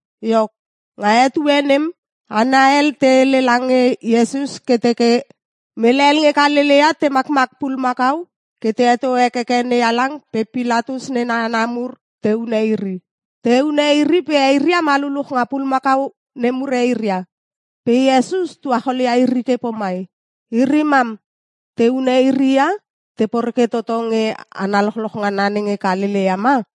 Iok, nga etue nem hana hel te hele lange Iesus ke teke, “Mele hel nge Kalelea te makmak pulumakau ke te heto hekeke NeHalang pe Pilatus nena hana mur te hune iri. Te hune iri pe eiria maluluch nga pulumakau nemur eiria.” Pe Iesus tuacholia iri ke pomai, “Iri mam, te hune iri ia? Te poreke toto nge hana lochloch ngana nenge Kalelea ma?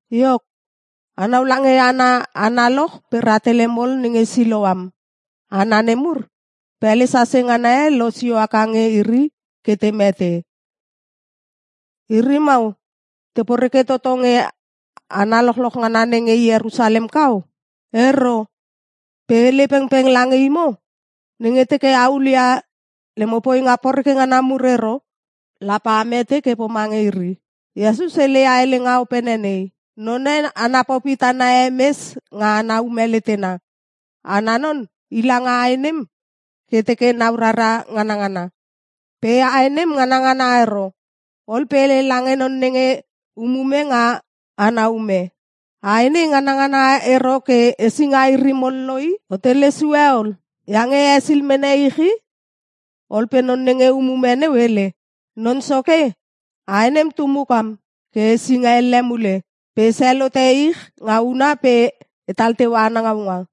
Iok, anau lange hana analoch pe rahtele mol nenge Siloam. Hana nemur, pele sase ngana e losio haka nge iri ke te mete. Iri mau te poreke toto nge hana lochloch ngana nenge Ierusalem kau? Ero! Pe e hele pengpeng lange imo, nenge teke a hulia lemo poinga poreke ngana mur ero lape a mete ke pomange iri.” Iesus heleia helenga opene nei, “None ana popi tana e mes nga ana ume letena. Ana non i langa ae nem ke teke nau rara nganangana. Pe ae nem nganangana ero. Ol pe hele lange non nenge umume nga ana ume. ‘Ae nei nganangana ero ke hesinga iri mol lo i! O telesue ol! Iange hesil mene ich i.’ Ol pe non nenge umume neu hele, ‘Non soke, ae nem tu mukam ke hesinga elle mule. Pe esel hote ich nga huna pe etal teua ana ngaunga.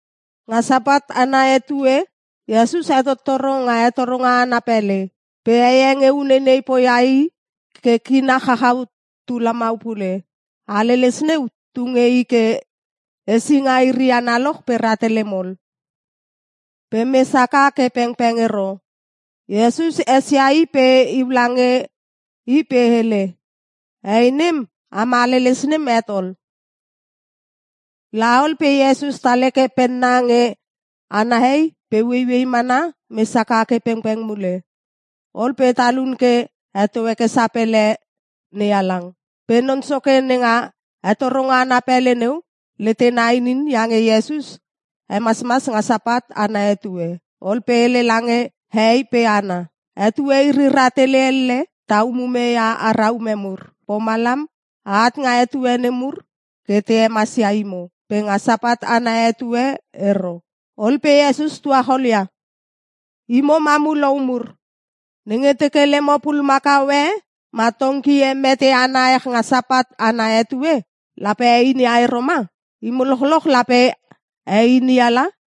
Nga Sapat ana etue Iesus hetottoro nga hetoronga ana pele. Pe hei e nge uneinei poia i ke kina chachau tu lamau pule. Haleles neu tu nge i ke hesinga iri analoch pe rahtele mol. Pe mes haka ke pengpeng ero. Iesus esia i pe iu lange i pe hele, “Hei nem, am haleles nem het ol.” La ol pe Iesus tal heke penna nge ana hei pe ueiuei mana mes haka ke pengpeng mule. Ol pe talun ke heto heke sapele NeHalang. Pe non soke nenga hetoronga ana pele neu letena inin iange Iesus hemasmas nga Sapat ana etue. Ol pe hele lange hehei pe hana, “Etue iri rahtele elle ta umume ia ara ume mur. Pomalam aat nga etue nemur ke te hemasia imo. Pe nga Sapat ana etue ero.” Ol pe Iesus tuacholia, “Imo mamulou mur! Nenge teke lemo pulumakau e ma tongki e mete ana ech nga Sapat ana etue, lape a einia ero ma? Imo lochloch lape a einia la!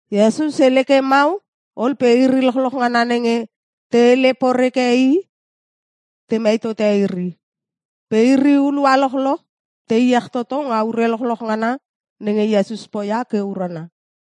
Iesus hele ke mau ol pe iri lochloch ngana nenge te hele poreke i temei tote iri. Pe iri hulua lochloch te iech toto nga ure lochloch ngana nenge Iesus poia ke urana.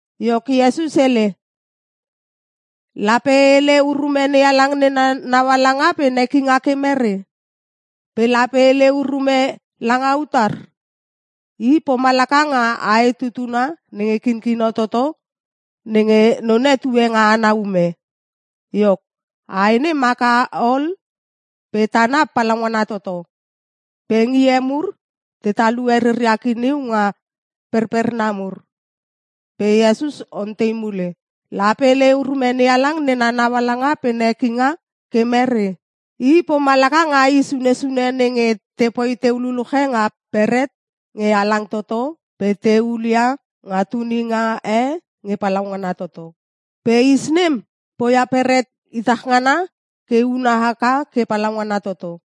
Iok Iesus hele, “Lape e hele urume NeHalang nena naualanga pe nekinga ke mere? Pe lape e hele urume langa utar? I pomalaka nga ae tutuna nenge kinkino toto nenge none tue nga ana ume. Iok, ae nem haka ol pe tana palaungana toto. Pe ngie mur te talue reria kiniu nga perperna mur.” Pe Iesus ontei mule, “Lape e hele urume NeHalang nena naualanga pe nekinga ke mere? I pomalaka nga is unne sune nenge tepoi teu luluche nga beret nge halang toto pe te hulia nga tuninga e nge palaungana toto. Pe is nem poia beret itach ngana ke una haka ke palaungana toto.”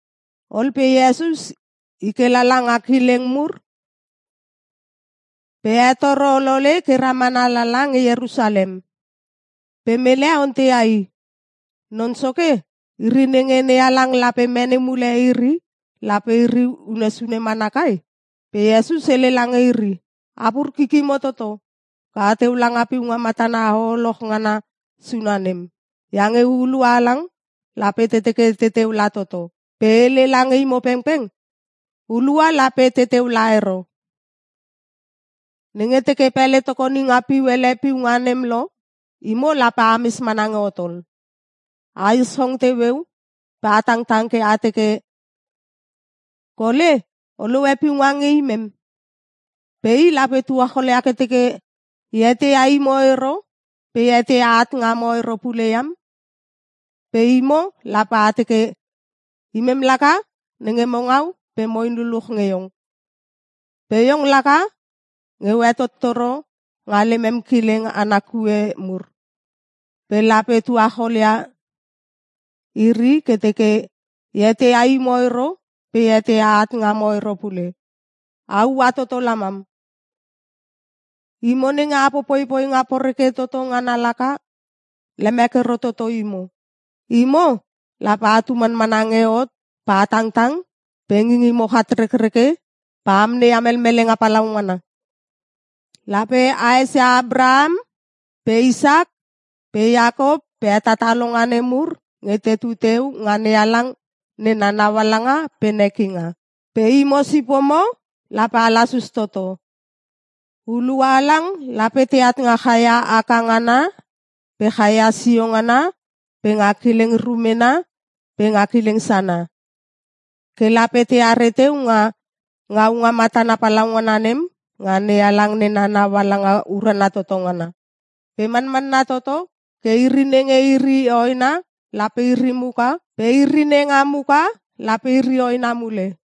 Ol pe Iesus i ke lala nga kileng mur pe hetoro olole ke ramana lala nge Ierusalem. Pe mele onteia i, “Non soke, iri nenge NeHalang lape mene mule iri lape iri unne sune mana kai?” Pe Iesus hele lange iri, “Apur kikimo toto ke a teu langa piunga matana hoholoch ngana sune nem. Iange hulua halang lape te teke teteu la toto. Pe e hele lange imo pengpeng hulua lape teteu la ero. Nenge teke pele tokoninga piu hele piunga nem lo imo lape ames mana nge hot ol. A ischong teueu pe a tangtang ke a teke, ‘Kole, o lohe piunga nge imem!’ “Pe i lape tuacholia ke teke, ‘E eteia imo ero pe e eteia aat ngamo ero pule iam!’ “Pe imo lape a teke, ‘Imem laka nenge mo ngau pe moin luluch nge iong. Pe iong laka nge o hetottoro nga lemem kileng ana kue mur.’ “Pe lape tuacholia iri ke teke, ‘E eteia imo ero pe e eteia aat ngamo ero pule! A ua toto lamam. Imo nenge a popoi poinga poreke toto ngana laka. Lemek ero toto imo!’ “Imo lape atu manmana nge hot pe a tangtang pe ngingimo chatrekreke pe a amneia melmelenga palaungana. Lape a esia Apraham pe Isak pe Iakop pe hetatalonga nemur nge tetu teu nga NeHalang nena naualanga pe nekinga. Pe imo sipomo lape a lasus toto. Hulua halang lape teat nga chaia aka ngana pe chaia sio ngana pe nga kileng rumena pe nga kileng sana. Ke lape teare teu nga ngaunga matana palaungana nem nga NeHalang nena naualanga urana toto ngana. Pe manmanna toto ke iri nenge iri hoena lape iri muka pe iri nenga muka lape iri hoena mule.”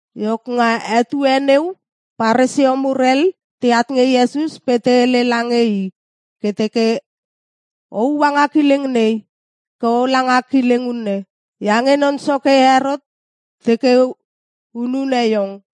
Iok nga etue neu Paresio mur hel teat nge Iesus pe te hele lange i ke teke, “O ua nga kileng nei ke ola nga kileng unne. Iange non soke Herot teke hunune iong.”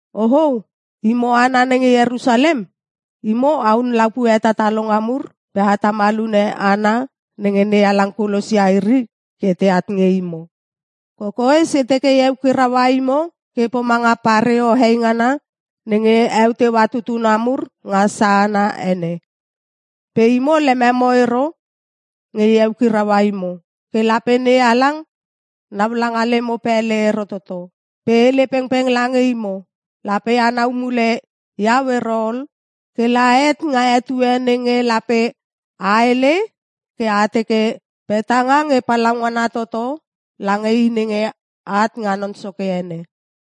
“Ochou! Imo hana nenge Ierusalem! Imo ahun lapue hetatalonga mur pe a tamal hune hana nenge NeHalang kulosia iri ke teat nge imo. Kokoes e teke e eukiraua imo ke pomanga pareo heingana nenge eu teua tutuna mur nga sahana ene. Pe imo lememo ero nge e eukiraua imo. Ke lape NeHalang nau langa lemo pele ero toto. Pe e hele pengpeng lange imo, lape anau mule iau ero ol kela het nga etue nenge lape a hele ke a teke, ‘Petenga nge palaungana toto lange i nenge at nga Non Soke ene.’”